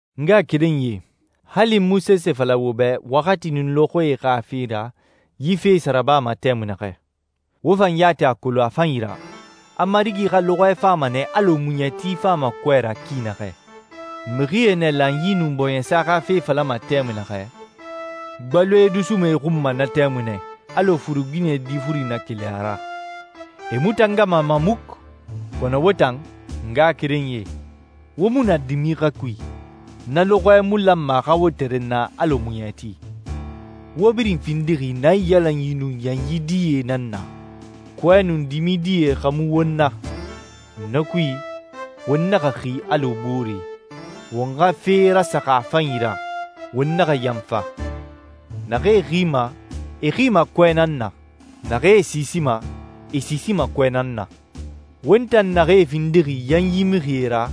N ngaxakerenyie, hali n mu sese fala wo bɛ waxati nun lɔxɔɛe xa fe ra yi fee sa rabama tɛmui naxɛ. Wo fan yati a kolon a fanyi ra, a Marigi xa lɔxɔɛ fama nɛ alɔ muɲɛti fama kɔɛ ra ki naxɛ. Mixie nɛ lanyi nun bɔɲɛsa xa fe falama tɛmui naxɛ, gbaloe dusuma e xun ma na tɛmui nɛ, alɔ furuginɛ difuri na keli a ra. E mu tangama a ma muku. Kɔnɔ wo tan, ngaxakerenyie, wo mu na dimi xa kui. Na lɔxɔɛ mu lanma a xa wo tɛrɛnna alɔ muɲɛti. Wo birin findixi naiyalanyi nun yanyi die nan na. Kɔɛ nun dimi die xa mu won na. Na kui, won naxa xi alɔ booree. Won xa fee rasaxa a fanyi ra, won naxa yanfa. Naxee xima, e xima kɔɛ nan na. Naxee siisima, e siisima kɔɛ nan na. Won tan naxee findixi yanyi mixie ra,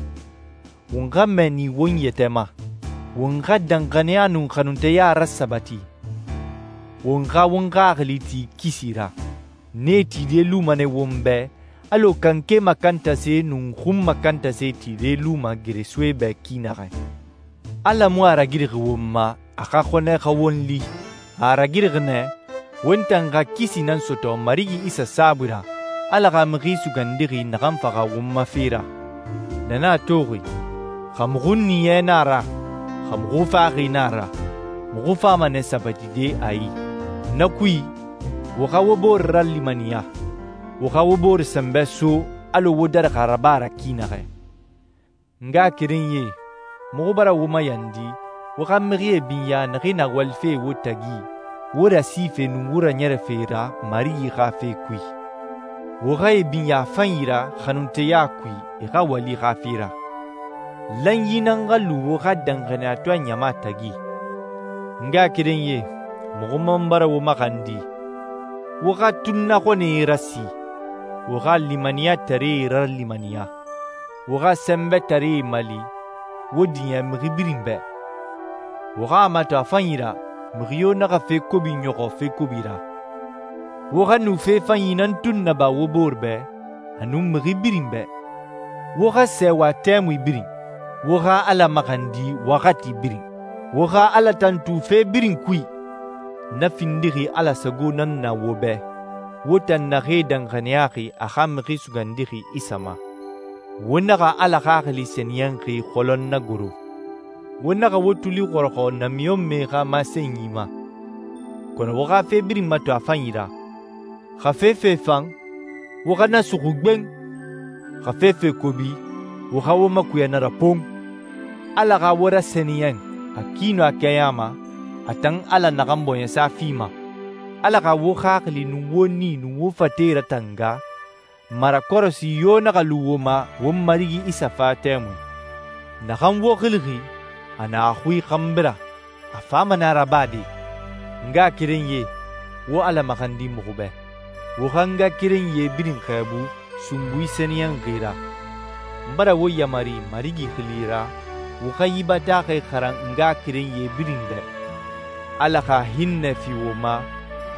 won xa mɛɛni won yɛtɛ ma. Won xa danxaniya nun xanunteya rasabati, won xa won xaxili ti kisi ra. Nee tide luma nɛ won bɛ alɔ kanke makantase nun xun makantase tide luma geresoe bɛ ki naxɛ. Ala mu a ragirixi won ma, a xa xɔnɛ xa won li. A a ragirixi nɛ won tan xa kisi nan sɔtɔ Marigi Isa saabui ra, Ala xa Mixi Sugandixi naxan faxa won ma fe ra. Na nan a toxi, xa muxu ɲiɲɛ nan a ra, xa muxu faxaxi nan a ra, muxu fama nɛ sabatide a i. Na kui, wo xa wo bore ralimaniya, wo xa wo bore sɛnbɛ so alɔ wo darixi a raba ra ki naxɛ. N ngaxakerenyie, muxu bara wo mayandi wo xa mixie binya naxee na walife wo tagi, wo rasife nun wo raɲɛrɛfe ra Marigi xa fe kui. Wo xa e binya a fanyi ra xanunteya kui e xa wali xa fe ra. Lanyi nan xa lu wo xa danxaniyatɔɛ ɲama tagi. N ngaxakerenyie, muxu man bara wo maxandi, wo xa tunnaxɔnɛe rasi, wo xa limaniyataree ralimaniya, wo xa sɛnbɛtaree mali, wo diɲɛ mixi birin bɛ. Wo xa a mato a fanyi ra mixi yo naxa fe kobi ɲɔxɔ fe kobi ra. Wo xa nu fe fanyi nan tun naba wo bore bɛ, a nun mixi birin bɛ. Wo xa sɛɛwa tɛmui birin. Wo xa Ala maxandi waxati birin. Wo xa Ala tantu fe birin kui. Na findixi Ala sago nan na wo bɛ, wo tan naxee danxaniyaxi a xa Mixi Sugandixi Isa ma. Wo naxa Ala Xaxili Sɛniyɛnxi xɔlɔn nagoro. Wo naxa wo tuli xɔrɔxɔ namiɲɔnmɛe xa masenyie ma, kɔnɔ wo xa fe birin mato a fanyi ra. Xa fefe fan, wo xa na suxu gben. Xa fefe kobi, wo xa wo makuya na ra pon! Ala xa wo rasɛniyɛn a ki nun a kɛɲa ma, a tan Ala naxan bɔɲɛsa fima. Ala xa wo xaxili nun wo nii nun wo fate ratanga, marakɔrɔsi yo naxa lu wo ma won Marigi Isa fa tɛmui. Naxan wo xilixi, a na a xui xanbi ra, a fama nɛ a rabade. N ngaxakerenyie, wo Ala maxandi muxu bɛ. Wo xa ngaxakerenyie birin xɛɛbu sunbui sɛniyɛnxi ra. N bara wo yamari Marigi xili ra wo xa yi bataaxɛ xaran ngaxakerenyie birin bɛ. Ala xa hinnɛ fi wo ma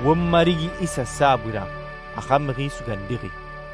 won Marigi Isa saabui ra, a xa Mixi Sugandixi.